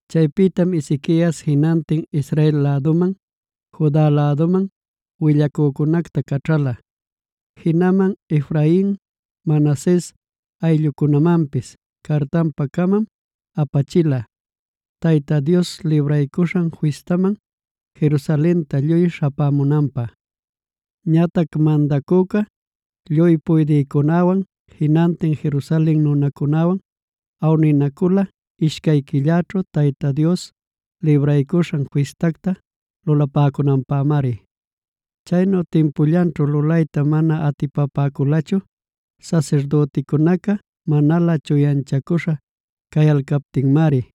Chaypïtam Ezequias jinantin Israel läduman, Juda läduman willacücunacta caćhala; jinaman Efrain, Manases ayllucunämanpis cartanpa-camam apachila, Tayta Dios Libraycuśhan Fistamana Jerusalenta lluy śhapämunanpä. Ñatac Mandacüca lluy puydïcunäwan, jinantin Jerusalen nunacunäwan awninacüla, ishcay quilläćhu Tayta Dios Libraycuśhan Fistacta lulapäcunanpämari. Chaynu timpullanćhu lulayta mana atipapäculachu sasirdüticunaca manalä chuyanchacüśha cayalcaptinmari;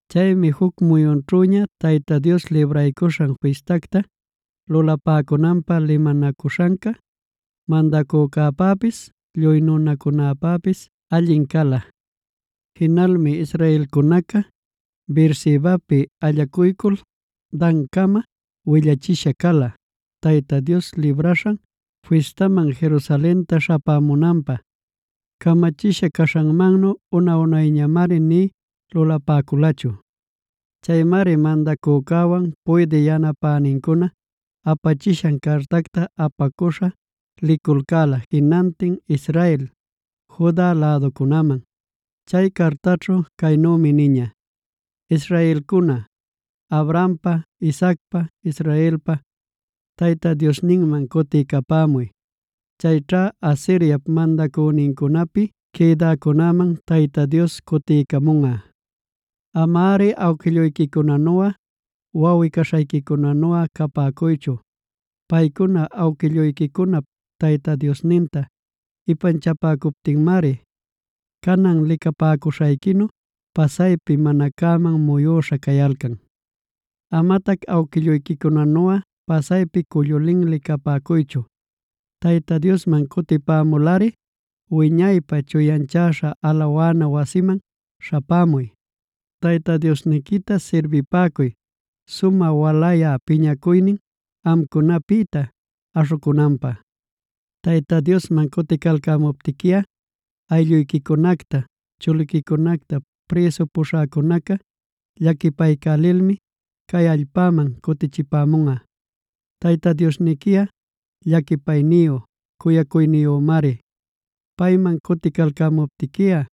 Chaymi juc muyunćhüña Tayta Dios Libraycuśhan Fistacta lulapäcunanpä limanacuśhanca mandacücäpäpis lluy nunacunäpäpis allin cala. Jinalmi israelcunaca Beersebapi allacuycul Dancama willachisha cala Tayta Dios Libraśhan Fistaman Jerusalenta śhapämunanpä. Camachisha caśhanmannu una-unayñamari nï lulapäculachu. Chaymari mandacücäwan puydï yanapänincuna apachishan cartacta apacuśha liculcäla jinantin Israel, Juda läducunäman. Chay cartaćhu caynümi niña: “Israelcuna, Abrahampa, Isaacpa, Israelpa Tayta Diosninman cutiycapämuy. Chayćha Asiriap mandacünincunapi quïdäcunäman Tayta Dios cutiycamunꞌa. Amari awquilluyquicunanuꞌa, wawꞌi-caśhayquicunanuꞌa capäcuychu. Paycuna awquilluyquicunap Tayta Diosninta ipanchapäcuptinmari canan licapäcuśhayquinu, pasaypi mana cäman muyüśha cayalcan. Amatac awquilluyquicunanu pasaypi cullu linli capäcuychu. Tayta Diosman cutipämulꞌari wiñaypä chuyanchaśhan alawana wasinman śhapämuy. Tayta Diosniquita sirbipäcuy sumä walayä piñacuynin amcunapïta aśhucunanpä. Tayta Diosman cuticalcämuptiquiꞌa aylluyquicunacta, chuliquicunacta prïsu puśhäcunaca llaquipaycälilmi cay allpaman cutichipämunꞌa. Tayta Diosniquiꞌa llaquipayniyu, cuyacuyniyümari. Payman cuticalcämuptiquiꞌa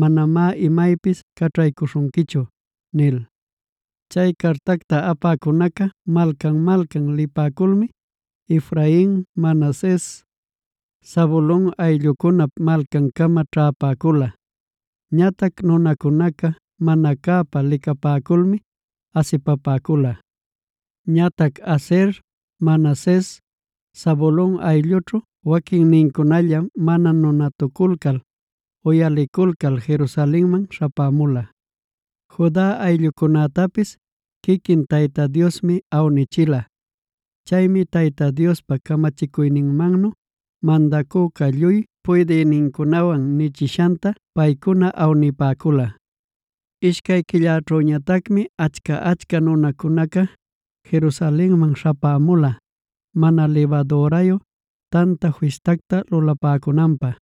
manamá imaypis caćhaycälishunquichu” nil. Chay cartacta apäcunaca malcan-malcan lipäculmi Efrain, Manases, Zabulon ayllucunap malcancama ćhäpäcula. Ñatac nunacunacá mana cäpa licapäculmi asipapäcula. Ñatac Aser, Manases, Zabulon ayllućhu waquinnincunallam mana nunatuculcal, uyaliculcal Jerusalenman śhapämula. Juda ayllucunätapis quiquin Tayta Diosmi awnichila. Chaymi Tayta Diospa camachicuyninmannu mandacüca lluy puydïnincunawan nichishanta paycuna awnipäcula. Ishcay quilläćhüñatacmi achca-achca nunacunaca Jerusalenman śhapämula Mana Libadürayu Tanta Fistacta lulapäcunanpä.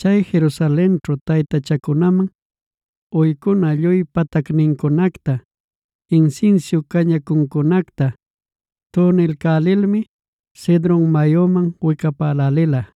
Chay Jerusalenćhu taytachacunaman uycuna lluy patacnincunacta, insinsiu cañacuncunacta tunilcälilmi Cedron mayuman wicapälälila.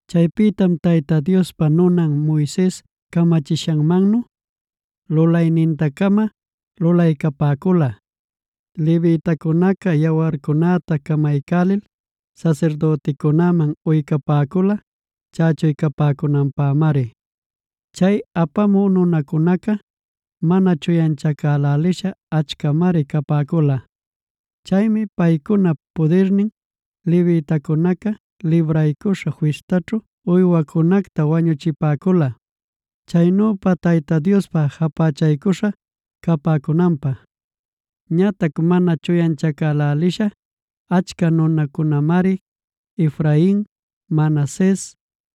Chaypïtam Tayta Diospa nunan Moises camachishanmannu lulayninta-cama lulaycapäcula. Levitacunaca yawarcunäta camaycälil sasirdüticunäman uycapäcula chächuycapäcunanpämari. Chay apamü nunacunaca mana chuyanchacälälisha achcamari capäcula. Chaymi paycunap pudirnin levitacunaca Libraycuśhan Fistaćhu uywacunacta wañuchipäcula, chaynüpa Tayta Diospa japächaycuśha capäcunanpä. Ñatac mana chuyanchacälälisha achca nunacunamari Efrain, Manases,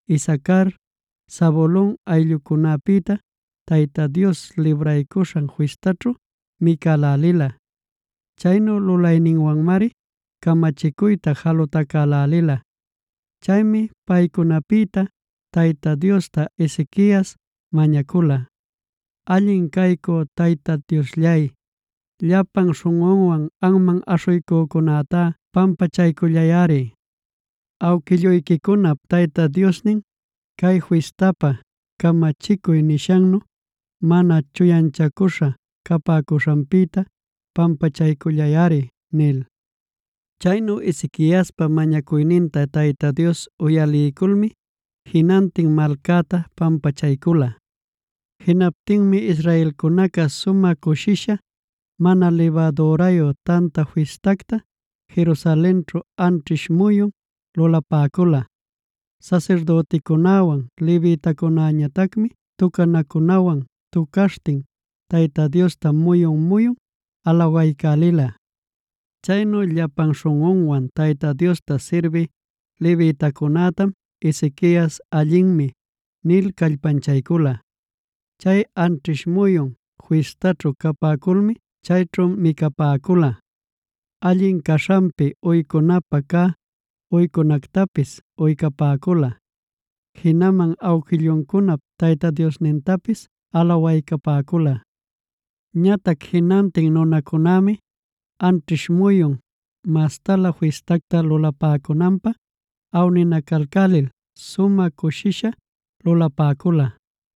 Isacar, Zabulon ayllucunapïta Tayta Dios Libraycuśhan Fistaćhu micälälila. Chaynu lulayninwanmari camachicuyta jalutacälälila. Chaymi paycunapïta Tayta Diosta Ezequias mañacula: “Allin caycü Tayta Diosllay, llapan śhunꞌunwan anman aśhuycücunätá pampachaycullayꞌari. Awquillücunap Tayta Diosnin, cay fistapa camachicuy nishannu mana chuyanchacüśha capäcuśhanpïta pampachaycullayꞌari” nil. Chaynu Ezequiaspa mañacuyninta Tayta Dios uyaliyculmi jinantin malcäta pampachaycula. Jinaptinmi israelcunaca sumä cushisha Mana Libadürayu Tanta Fistacta Jerusalenćhu anćhish muyun lulapäcula. Sasirdüticunäwan levitacunäñatacmi tucanacunawan tucaśhtin Tayta Diosta muyun-muyun alawaycälila. Chaynu llapan śhunꞌunwan Tayta Diosta sirbï levitacunätam Ezequiasꞌa “allinmi” nil callpanchaycula. Chay anćhish muyun fistaćhu capäculmi chayćhu micapäcula, allin caśhanpi uycunapä cä uycunactapis uycapäcula, jinaman awquilluncunap Tayta Diosnintapis alawaycapäcula. Ñatac jinantin nunacunämi anćhish muyun mastalä fistacta lulapacunanpä awninacalcälil sumä cushisha lulapäcula.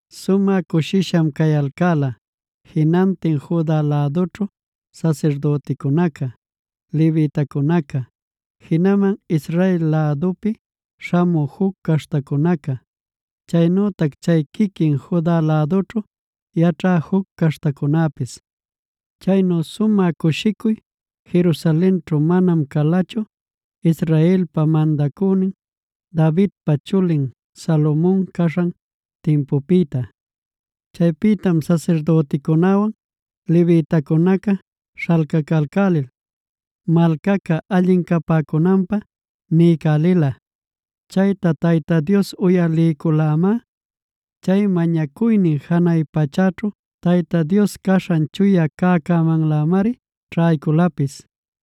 Sumä cushisham cayalcäla: jinantin Juda lädućhu sasirdüticunaca, levitacunaca, jinaman Israel lädupi śhamü juc caśhtacunaca, chaynütac chay quiquin Juda lädućhu yaćhä juc caśhtacunäpis. Chaynu sumä cushicuy Jerusalenćhu manam calachu Israelpa mandacünin Davidpa chulin Salomon caśhan timpupïta. Chaypïtam sasirdüticunäwan levitacunaca śhalcalcälil malcaca allin capäcunanpä niycälila. Chayta Tayta Dios uyaliyculamá. Chay mañacuynin janay pachäćhu Tayta Dios caśhan chuya cäcämanlämari ćhayculapis.